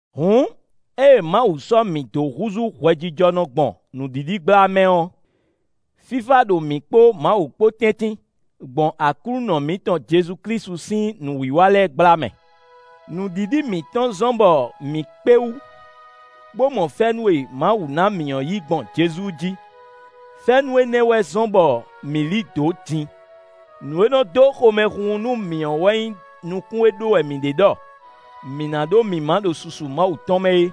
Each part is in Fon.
Hǔn, ée Mawu sɔ́ mǐ dó húzú hwɛjijɔnɔ gbɔn nǔɖiɖi gbla mɛ ɔ́, fífá ɖo mǐ kpo Mawu kpo tɛ́ntin, gbɔn Aklúnɔ mǐtɔn Jezu Klísu sín nǔwiwa lɛ́ɛ gbla mɛ. Nǔɖiɖi mǐtɔn zɔ́n bɔ mǐ kpé wú, bó mɔ fɛ́nú e Mawu ná mǐ ɔ́ yí gbɔn Jezu jí; fɛ́nú énɛ́ wɛ zɔ́n bɔ mǐ lí dǒ din. Nǔ e nɔ dó xomɛhunhun nú mǐ ɔ́ wɛ nyí nukún e ɖó wɛ mǐ ɖe ɖɔ mǐ ná ɖó mǐmá ɖo susu Mawu tɔn mɛ é.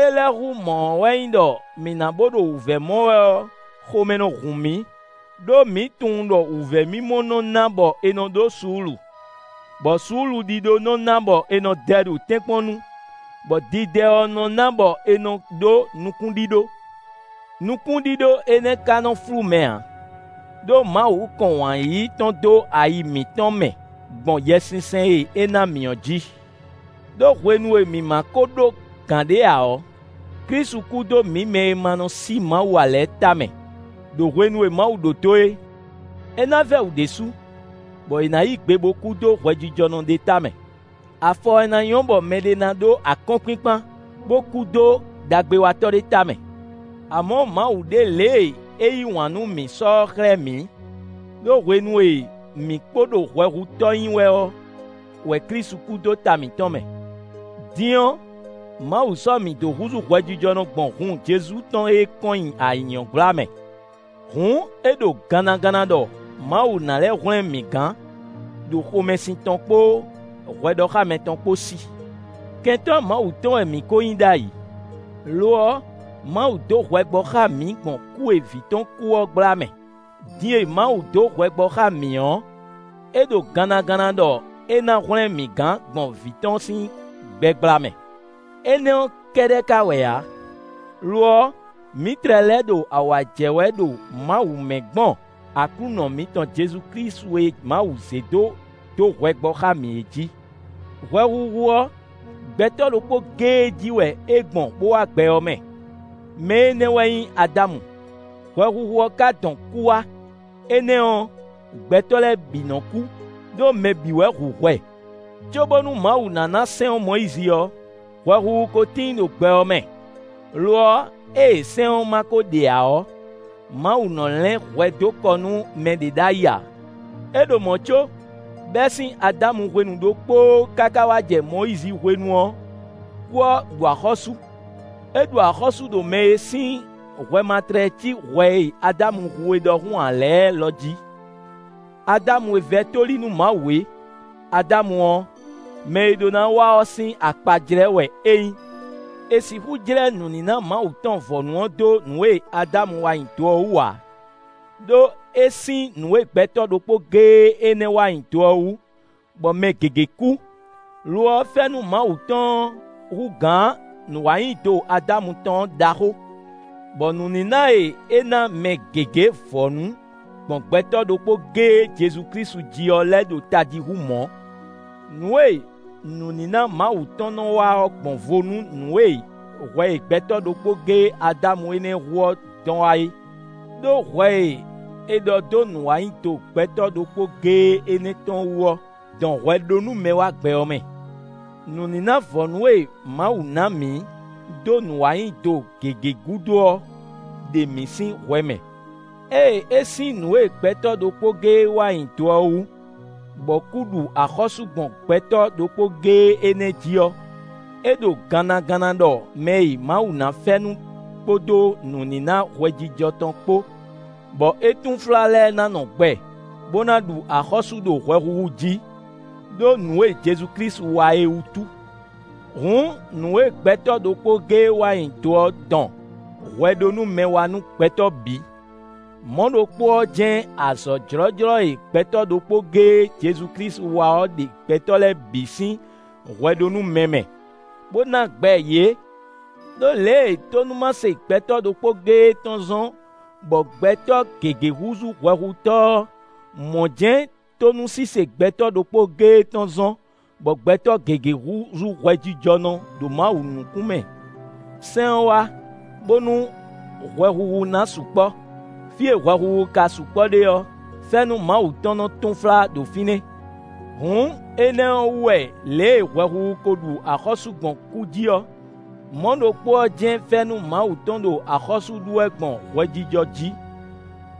Ée lɛ́ hú mɔ̌ ɔ́ wɛ nyí ɖɔ mǐ na bo ɖo wǔvɛ́ mɔ wɛ ɔ́, xomɛ nɔ hun mǐ, ɖó mǐ tunwun ɖɔ wǔvɛ́mimɔ nɔ ná bɔ è nɔ ɖó suúlu; bɔ suúluɖíɖó nɔ́ ná bɔ è nɔ dɛ ɖo tɛ́nkpɔ́n nu, bɔ didɛ ɔ́ nɔ́ ná bɔ è nɔ ɖó nukúnɖíɖó. Nukúnɖíɖó énɛ́ ka nɔ flú mɛ ǎ, ɖó Mawu kɔn wǎn yíyí tɔn dó ayi mǐtɔn mɛ gbɔn Yɛsinsɛn e é ná mǐ ɔ́ jí. Đó hwenu e mǐ ma kó ɖó gǎn ɖé ǎ ɔ́, Klísu kú dó mǐ mɛ e ma nɔ sí Mawu ǎ lɛ́ɛ tamɛ, ɖo hwenu e Mawu ɖó dó é. É ná vɛ́ wǔ ɖésú, bɔ è nǎ yí gbe bo kú dó hwɛjijɔnɔ ɖé tamɛ. Afɔ wɛ ná nyɔ́ bɔ mɛɖé ná ɖó akɔ́nkpinkpan bó kú dó ɖagbewatɔ́ ɖé tamɛ. Amɔ̌, Mawu ɖe lě e é yí wǎn nú mǐ sɔ́ ɔ́ xlɛ́ mǐ, ɖó hwenu e mǐ kpo ɖo hwɛhutɔ́ nyí wɛ ɔ́ wɛ Klísu kú dó ta mǐtɔn mɛ. Din ɔ́, Mawu sɔ́ mǐ dó húzú hwɛjijɔnɔ gbɔn hun Jezu tɔn e kɔn nyi ayǐ ɔ́ gbla mɛ. Hǔn é ɖo gannaganna ɖɔ Mawu ná lɛ́ hwlɛ́n mǐ gán ɖo xomɛsin tɔn kpó hwɛɖɔxámɛ tɔn kpó sí. Kɛntɔ́ Mawu tɔn wɛ mǐ kó nyí ɖ'ayǐ; lo ɔ́, Mawu dó hwɛ gbɔ xá mǐ gbɔn kú e Vǐ tɔn kú ɔ́ gbla mɛ. Din e Mawu dó hwɛ gbɔ xá mǐ ɔ́, é ɖo gannaganna ɖɔ é ná hwlɛ́n mǐ gán gbɔn vǐ tɔn sín gbɛ gbla mɛ. Énɛ́ ɔ́ kɛ́ɖɛ́ ka wɛ ǎ; lo ɔ́, mǐ tlɛ lɛ́ ɖo awǎ jɛ wɛ ɖo Mawu mɛ gbɔn Aklúnɔ mǐtɔn Jezu Klísu e Mawu zé dó dó hwɛ gbɔ xá mǐ é jí. Hwɛhuhu ɔ́, gbɛtɔ́ ɖokpó géé jí wɛ é gbɔn bó wá gbɛ ɔ́ mɛ; mɛ énɛ́ wɛ nyí Adámu; hwɛhuhu ɔ́ ka dɔn kú wá. Énɛ́ ɔ́, gbɛtɔ́ lɛ́ɛ bǐ nɔ kú, ɖó mɛ bǐ wɛ hu hwɛ. Cóbónú Mawu ná ná sɛ́n ɔ́ Mɔyízi ɔ́, hwɛhuhu ko tíin ɖo gbɛ ɔ́ mɛ; lo ɔ́, ée sɛ́n ɔ́ ma kó ɖe ǎ ɔ́, Mawu nɔ lɛ́n hwɛ dó kɔ nú mɛɖé ɖ'ayǐ ǎ. É ɖo mɔ̌ có, bɛ́ sín Adámu hwenu ɖokpóó káká wá jɛ Mɔyízi hwenu ɔ́, kú ɔ́ ɖu axɔ́sú; é ɖu axɔ́sú ɖo mɛ e sín hwɛ ma tlɛ cí hwɛ e Adámu hu é ɖɔhun ǎ lɛ́ɛ lɔ jí; Adámu e vɛ́ tóli nú Mawu é. Adámu ɔ́, mɛ e ɖó ná wá ɔ́ sín akpajlɛ́ wɛ é nyí. È sixú jlɛ́ nǔníná Mawu tɔn vɔ̌nu ɔ́ dó nǔ e Adámu wa nyi do ɔ́ wú ǎ; ɖó é sín nǔ e gbɛtɔ́ ɖokpó géé énɛ́ wa nyi do ɔ́ wú, bɔ mɛ gěgé kú; lo ɔ́ fɛ́nú Mawu tɔn ɔ́ hú gǎn nǔwanyido Adámu tɔn ɔ́ ɖaxó, bɔ nǔníná e é ná mɛ gěgé vɔ̌nu gbɔn gbɛtɔ́ ɖokpó géé jí ɔ́ (Jezu Klísu) lɛ́ ɖo tají hú mɔ̌. Nǔ e nǔníná Mawu tɔn nɔ wa ɔ́ gbɔn vo nú nǔ e hwɛ e gbɛtɔ́ ɖokpó géé (Adámu) énɛ́ hu ɔ́ dɔn wá é. Đó hwɛ e è ɖɔ dó nǔwanyido gbɛtɔ́ ɖokpó géé énɛ́ tɔn ɔ́ dɔn hwɛɖónúmɛ wá gbɛ ɔ́ mɛ. Nǔníná vɔ̌nu e Mawu ná mǐ dó nǔwanyido gěgé gúdo ɔ́ ɖe mǐ sín hwɛ mɛ. Ée é sín nǔ e gbɛtɔ́ ɖokpó géé wa nyi do ɔ́ wú, bɔ kú ɖu axɔ́sú gbɔn gbɛtɔ́ ɖokpó géé énɛ́ jí ɔ́, é ɖo gannaganna ɖɔ mɛ e Mawu ná fɛ́nú kpódó nǔníná hwɛjijɔ tɔn kpó, bɔ é túnflá lɛ́ɛ ná nɔ gbɛ bó ná ɖu axɔ́sú ɖo hwɛhuhu jí, ɖó nǔ e Jezu-Klísu wa é wútu. Hǔn nǔ e gbɛtɔ́ ɖokpó géé wa nyi do ɔ́ dɔn hwɛɖónúmɛ wá nú gbɛtɔ́ bǐ, mɔ̌ ɖokpó ɔ́ jɛ́n azɔ̌ jlɔ́jlɔ́ e gbɛtɔ́ ɖokpó géé (Jezu Klísu) wa ɔ́ ɖe gbɛtɔ́ lɛ́ɛ bǐ sín hwɛɖónúmɛ mɛ, bó ná gbɛ yě. Đó lě e tónúmase gbɛtɔ́ ɖokpó géé tɔn zɔ́n bɔ gbɛtɔ́ gěgé húzú hwɛhutɔ́ ɔ́, mɔ̌ jɛ́n tónúsise gbɛtɔ́ ɖokpó géé tɔn zɔ́n bɔ gbɛtɔ́ gěgé húzú hwɛjijɔnɔ ɖo Mawu nukún mɛ. Sɛ́n ɔ́ wá, bónú hwɛhuhu ná sukpɔ́; fí e hwɛhuhu ka sukpɔ́ ɖe ɔ́, fɛ́nú Mawu tɔn nɔ túnflá ɖo fínɛ́. Hǔn énɛ́ ɔ́ wú wɛ lě e hwɛhuhu ko ɖu axɔ́sú gbɔn kú jí ɔ́, mɔ̌ ɖokpó ɔ́ jɛ́n fɛ́nú Mawu tɔn ɖo axɔ́sú ɖu wɛ gbɔn hwɛjijɔ jí,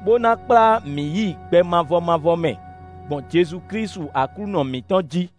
bó ná kplá mǐ yi gbɛ mavɔ mavɔ mɛ gbɔn Jezu Klísu Aklúnɔ mǐtɔn jí.